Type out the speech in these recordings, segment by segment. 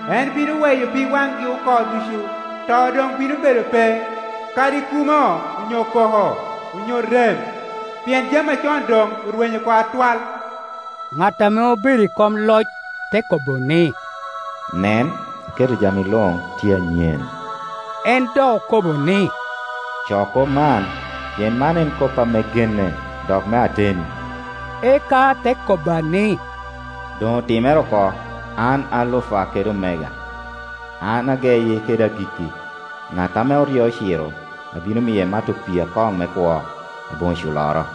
En bino weyo pig waŋgi oko ducu. To doŋ bino bedo pe, kadi kumo onyo koko, onyo rem, pien jami acon doŋ orwenyo oko atwal.” Ŋat ame obedo i kom loc te kobo ni, “Nen, aketo jami luŋ tye anyen.” En dok okobo ni, “Co kop man, pien man en kop ame genne, dok me ateni.” Eka te kobba ni, “Doŋ otimere oko! An Alufa kede Omega, an ageyi kede agikki. Ŋat ame oryo ociro, abino miye mato pii akoŋ me kwo, aboŋo culloro.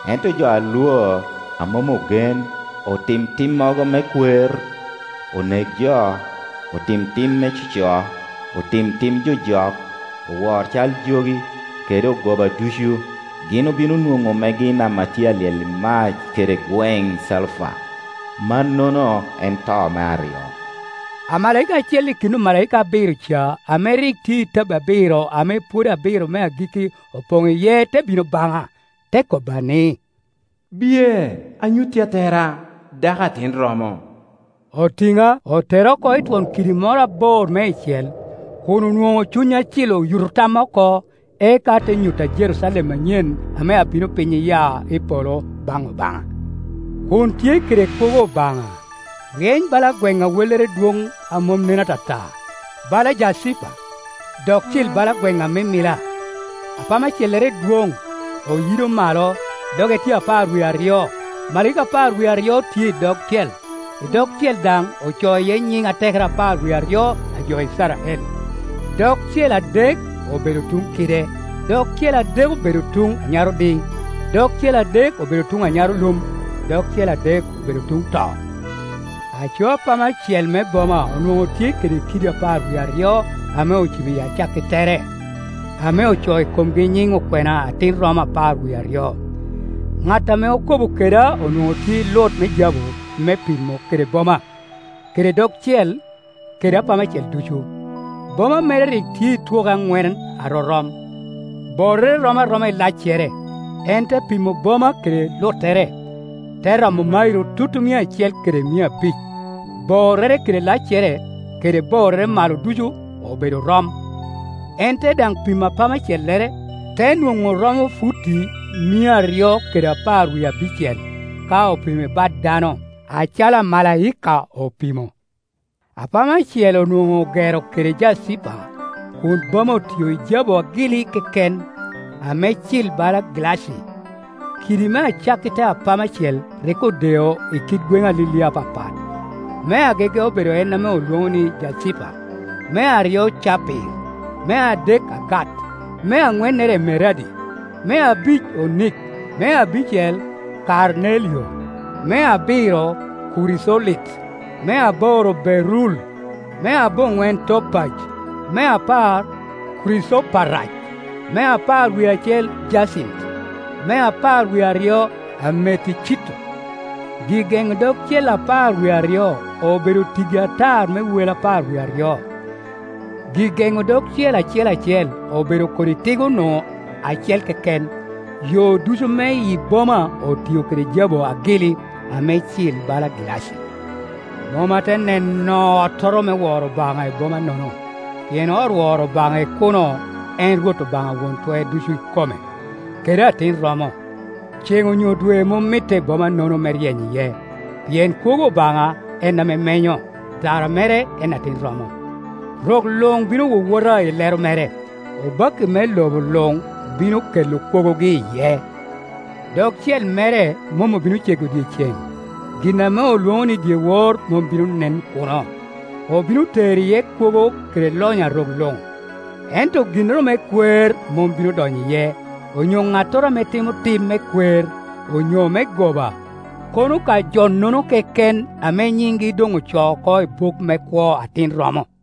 Ento jo a lwor, a mom ogen, otim timmogo me kwer, onek jo, otim tim me coco, otim tim jojok, owor cal jogi, kede ogoba ducu, gin obino nwoŋo megi i nam a tye a lyel i mac kede gweŋ calufa; mannono en to me aryo.” Amalaika acel i kin omalaika abiro ca ame rik tye i tabbi abiro ame pwodo abiro me agikki opoŋ iye te bino baŋa, te kobba ni, “Biye, anyutti Atera, dako Atin romo.” Otina, otera oko i twon kidi moro abor meicel, kun onwoŋo Cuny Acil oyuto tamma oko, eka te nyutta Jerucalem anyen ame abino piny iya i polo baŋ Obaŋa, kun tye kede kwogo Obaŋa. Ryeny bala gweŋ a wellere dwon a mom nen ata ta, bala jacipa, dok cil bala gweŋ amimila. Apama cellere dwon, oyido malo, doge tye apar wie aryo. Omalaika apar wie aryo tye i dogcel, i dogcel daŋ ocoo iye nyiŋ atekere apar wie aryo li jo Icrael. Dogcel adek obedo tuŋ kide, dogcel adek obedo tuŋ anyarodi, dogcel adek obedo tuŋ anyarolum, dogcel adek obedo tuŋ to. Aco apama cel me boma onwoŋo tye kede kiddi apar wie aryo ame ocibo i acakki tere, ame ocoo i komgi nyiŋ okwena Atin romo apar wie aryo. Ŋat ame okobo keda onwoŋo tye i lut me jabu me pimo kede boma, kede dogcel, kede apama cel ducu. Boma mere rik tye i twoke aŋwen arorom, borrere rom aroma i laccere. En te pimo boma kede luttere, te romo mairo tutumia acel kede mia abic; borrere kede laccere kede borrere malo ducu obedo rom. En te dan pi mo apama cellere, te nwoŋo romo futi mia aryo kede apar wie abicel, ka opimo i bat dano, acalo amalaika opimo. Apama cel onwoŋo ogero kede jacipa, kun boma otio i jabu agili keken, ame cil bala gilaci. Kiddi me acakki te apama cel rik odeo i kit gweŋe alilia apapat. Me agege obedo en ame olwono ni jacipa, me aryo capir, me adek agat, me aŋwennere emeradi, me abic onik, me abicel kamelio, me abiro kuricolit, me aboro berul, me aboŋwen topaj, me apar kuricoparac, me apar wie acel jacint, me apar wie aryo ameticito. Gi-geŋo dogcel apar wie aryo obedo tiggi atar me wel apar wie aryo, gi-geŋo dogcel acel acel obedo kodi tigo-nu acel keken; yo ducu me yi boma otio kede jabu agili, ame cil bala gilaci. Mom ate neno ottoro me woro Obaŋa i boma-nono, pien ot woro Obaŋa i kuno en Rwot Obaŋa Won Twer Ducu ikome, kede Atin romo. Ceŋ onyo dwe mom mitte i bomanono me ryeny iye, pien kwogo Obaŋa en ame menyo, tara mere en Atin romo. Rok luŋ bino wowota i lero mere, obakki me lobo luŋ bino kela kwogogi iye. Dogcel mere mom obino ce go dyeceŋ, gin ame olwono ni dyewor mom bino nen kuno. Obino tero iye kwogo kede lonyo a rok luŋ, ento ginnoro me kwer mom bino donyo iye, onyo ŋattoro ame timo tim me kwer, onyo me goba, kono ka jonono keken ame nyingi doŋ ocoo oko i buk me kwo Atin romo.